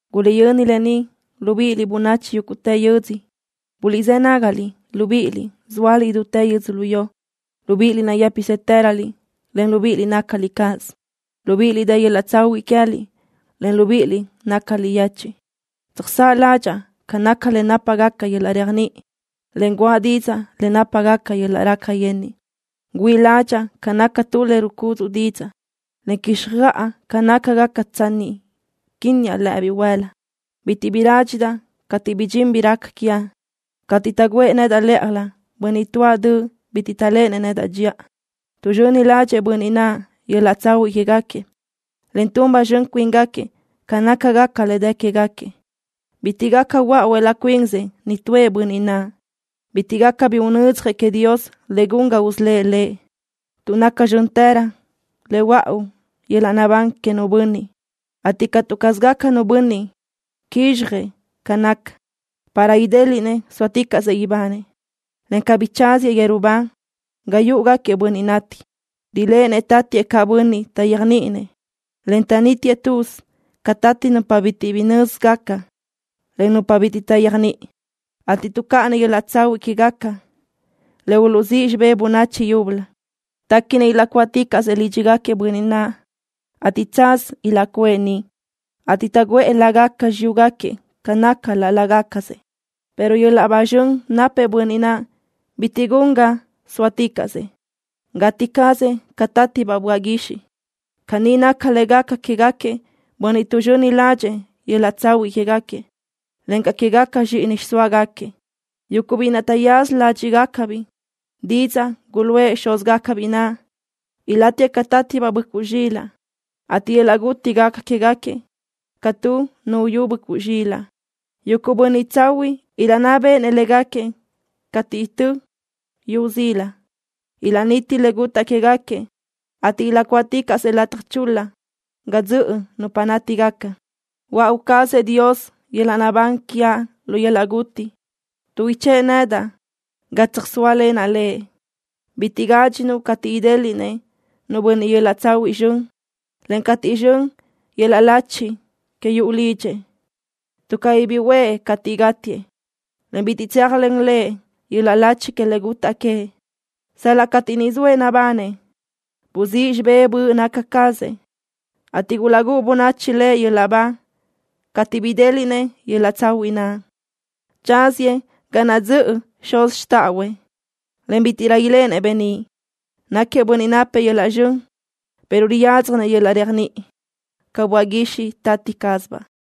Guliʼyöni lë ni, libíʼiliʼ, bönachi yúguʼtë yödzö. Buliʼzë́ nágaliʼ, libíʼiliʼ, zóaliʼ idútë yödzölió. Libíʼiliʼ, nayë́psëtëröliʼ, en libíʼiliʼ, nácaliʼ cáʼasö. Libíʼiliʼ, dë yöl-laʼ tsahuiʼ queë́liʼ, en libíʼiliʼ, nácaliʼ yechiʼ. Tsöjsáʼ ládxaʼa ca naca le nápagaca yöl-laʼ réajniʼi, en guʼa didzaʼ le nápagaca yöl-laʼ raca yenniʼ. Güíʼi ládxaʼa ca naca tu le rucudzuʼ didzaʼ, en quíxjöʼa ca nácagaca tsanni quinniaʼ lëʼe bihuël-la. Bitiʼ bi rádxidaʼ cateʼ ridxín bi raca quiaʼ, cateʼ taʼguʼë nedaʼ lë́ʼajlö bönniʼ tuáʼ döʼ bitiʼ taʼléʼenëʼ nedaʼ dxiʼa. Tuʼzxöni ládxëʼë bönniʼ naʼ yöl-laʼ tsahuiʼ quégaquiëʼ, en tun ba zxön cuíngaquiëʼ ca nácagaca le dë quégaquiëʼ. Bitiʼ gaca huöáʼuëʼ laʼ cuinsëʼ nitúëʼ bönniʼ naʼ. Bitiʼ gaca bi unödzjëʼ queëʼ Dios le gun ga usölë́ʼ lëʼ, tuʼ naca zxö́ntërö le huöáʼu yöl-laʼ naʼbán que nu bönniʼ, ateʼ catu caz gaca nu bönniʼ quizxjëʼ ca naca, para idéliʼnëʼ sóaticaʼsëʼ ibanëʼ, en cabí tsáziëʼ yeru ba ga yúʼugaquiëʼ bönniʼ nati. Riléʼenëʼ tatiëʼ caʼ bönniʼ taʼyéajniʼinëʼ, en taʼnitiëʼ tuz ca tati nupa bitiʼ bi nö́zigaca, en nupa bitiʼ taʼyéajniʼi, ateʼ tuʼcáʼanëʼ yöl-laʼ tsahuiʼ quégaquiëʼ le uluʼzíʼ xibé bönachi yúbölö. Téquinëʼ ilaʼcuáʼticaʼsö lídxigaquiëʼ bönniʼ naʼ, ateʼ tsaz ilaʼcuʼë niʼ, ateʼ taʼguʼë lágaca xiyúgaquiëʼ ca naca laʼ lágacasëʼ. Pero yöl-laʼ ba zxön napëʼ bönniʼ naʼ bitiʼ gun ga sóaticaʼsëʼ. Gati cazëʼ ca tátibaʼ böaʼ guixiʼ. Caní naca le gaca quégaquiëʼ bönniʼ tuʼzxöni ládxëʼë yöl-laʼ tsahuiʼ quégaquiëʼ, encaʼ quégaca zxíʼini xiʼsóagaquiëʼ, yuguʼ biʼi naʼ taʼyaza ládxiʼgacabiʼ didzaʼ guluʼë xúzgacabiʼ naʼ. Ilátiëʼ ca tátibaʼ böʼcuʼ zxilaʼ, ateʼ yöl-laʼ guti gaca quégaquiëʼ ca tu nu uyú böʼcuʼ zxilaʼ. Yuguʼ bönniʼ tsahuiʼ ilaʼnná béʼenëʼ légaquiëʼ cateʼ itö́ yu zila. Ilaʼniti le gutaʼ quégaquiëʼ, ateʼ ilaʼcuáʼticaʼsëʼ lataj chul-la ga dzöʼö nupa nátigaca. Huöáʼu cazëʼ Dios yöl-laʼ naʼbán quiaʼ lu yöl-laʼ guti, tuʼ ichë́ʼë nedaʼ ga tsöjsóalenaʼ Lëʼ. Bitiʼ gádxinuʼ cateʼ idéliʼnëʼ nu bönniʼ yöl-laʼ tsahuiʼ zxön, en cateʼ xön yöl-laʼ lachi que yuʼu lidxëʼ, tuʼ cabí bi uʼë cateʼ gátiëʼ, en bitiʼ tséajlen lëʼ yöl-laʼ lachi que le gutaʼ queëʼ. Sal-laʼ cateʼ niʼ zoëʼ nabanëʼ buzíʼ xibé böʼ naca cazëʼ, ateʼ gulaʼgúʼu bönachi lëʼ yöl-laʼ ba cateʼ bidéliʼnëʼ yöl-laʼ tsahuiʼ naʼ. Tsáziëʼ ga naʼ dzöʼë xuz xtáʼahuëʼ, en bítiʼrö iléʼenëʼ beníʼ. Náquiëʼ bönniʼ napëʼ yöl-laʼ zxön, pero riyádzjanëʼ yöl-laʼ réajniʼi, ca böaʼ guixiʼ tati cázabaʼ.